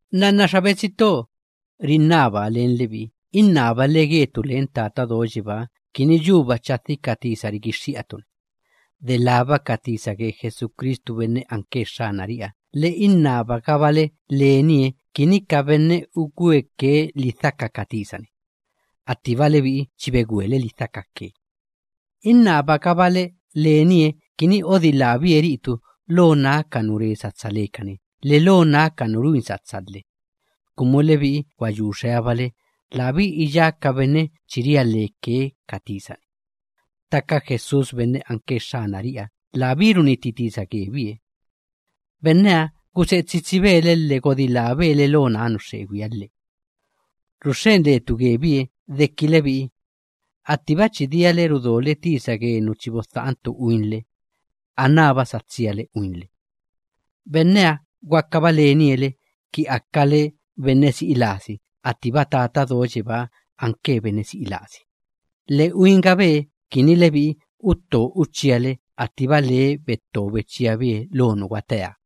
Nnanna xa betsi to, rinnabaa len lebi'i, innabale getu len Tata Do Yebáha kini yuba chadhi ka tisa rigixxi'atu‑ni, delába ka tisa ge Jesucristu benne anke Xxanari'iha, lhe innabagabale lenie kini ka benne ugweke lidhaka ka tisa‑ni, attiba lebi'i chi begwele lidhakake. Innabagabale lenie kini odilábie ri'itu lo ná ka nu re satsa lekani lhe lo ná ka nu ruin satsa lhe, kumu lebi'i gwa yu xeabale labí iyá ka benne chi ria leke ka tisa‑ni. Ttaka Jesús benne anke Xxanari'iha labí runnitti tisa gebie. Benneha guse'e tsitsibe le lhe godilábe le lo ná nu xxegwiha lhe. Ruxxen letu gebie deki lebi'i, attiba chi diale rudole tisa ge nu chi bodha'antu uinle, anába sa tsiale uinle. Benneha gwakaba lenie le ki akale benne si'i lasi attiba Tata Do Yebáha anke benne si'i lasi, lhe uingabe kini lebi'i utto uchíale attiba labie betto bechíabie lo nu gwateeha.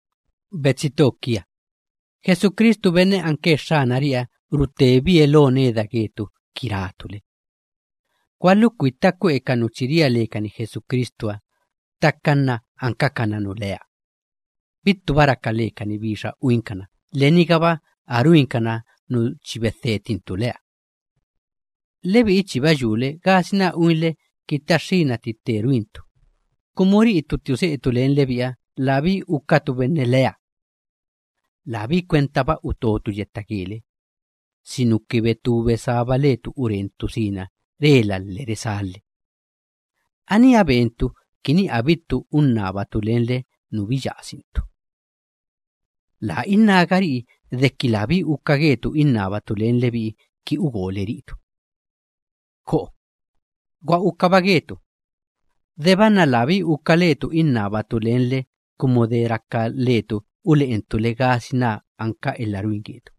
Betsi to kia, Jesucristu benne anke Xxanari'iha rutebie lo neda getu ki ratu le: “Gwalukwitta kwe'e ka nu chi ria lekani Jesucristuha, delába ka nu ankakana nu lea, bittuba raka lekani bixa uinkana, lhe nigaba a ruinkana nu chi bedhetintu leha.” Lebi'i chiba yule gasina uinle ki taxxína tti tte ruintu, kumu ri'itu tti use'etu len lebi'iha labí ukatu benne lea. Labí kwentaba utotu yetta gele, sinuki betú besába letu urentu sina rela lhe resá lhe. Aníha bentu kini abittu unnabatu lenle nu biyasintu. Laa innágari'i deki labí uka getu innabatu len lebi'i ki ugole ri'itu. ¡Ko'o! Gwa ukaba getu, deba nna labí uka letu innabatu lenle, kumu de raka letu ule'entu le gasina anka elha ruin getu,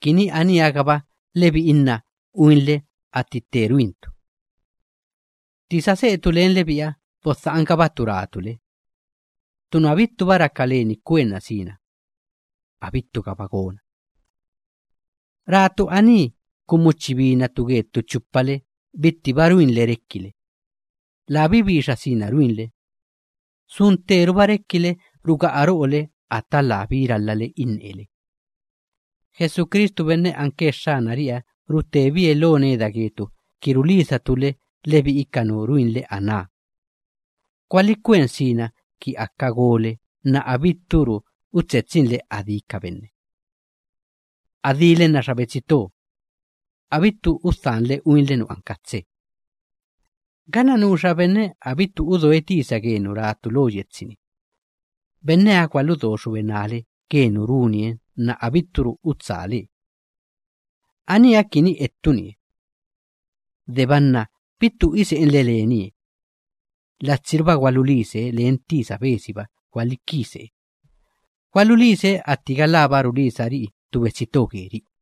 kini aníha‑gaba lebi'i nna uinle atti tte ruintu. Tti sa se'etu len lebi'iha bodha'angabatu ratu le: “Ttu nu abittuba raka leni kwenna sina, abittugaba gona.” Ratu aní kumu chi binatu ge ttu chupale bittiba ruinle rekile, labí bixa sina ruinle, sun tteruba rekile ruga'a ro'ole ata labí ralhale innele. Jesucristu benne anke Xxanari'iha rutebie lo neda getu ki rulisatu le. Lebi'i ka nu ruinle aná gwalikwen sina ki aka gole nna abitturu utsetsinle adí ka benne. Adíle nna xa betsi to, abittu udhanle uinle nu anka tse. Ganna nuxa benne abittu udoe tisa ge nu ratu lo yetsi‑ni, benneha gwaludo xubenále ge nu runie nna abitturu utsálee. Aníha kini ettunie. Deba nna bittu ise'enle lenie, latsiruba gwalulise, len tisa besiba gwalikise, gwalulise atti galába rulisari'i ttu betsi to geri'i.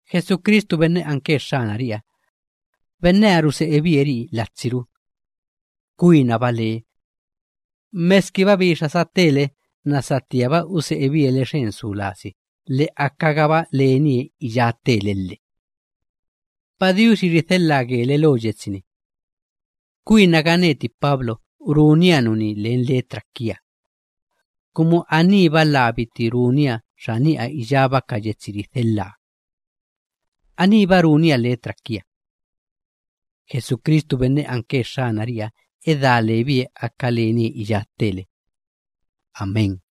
Jesucristu benne anke Xxanari'iha, benneha ruse'ebie ri'i latsiru. Kwinaba labie, meskiba bixa satele nna satíaba use'ebie le xen su lasi, lhe akagaba lenie iyá ttele lhe. Padiuxi ridhelhaa gele lo yetsi‑ni. Kwinaga neti Pablo runia nuní len letra kia, kumu aníba labiti runia xani'a iyába ka yetsi ridhelhaa. Aníba runia letra kia. Jesucristu benne anke Xxanari'iha edá lebie aka lenie iyá ttele. Amén.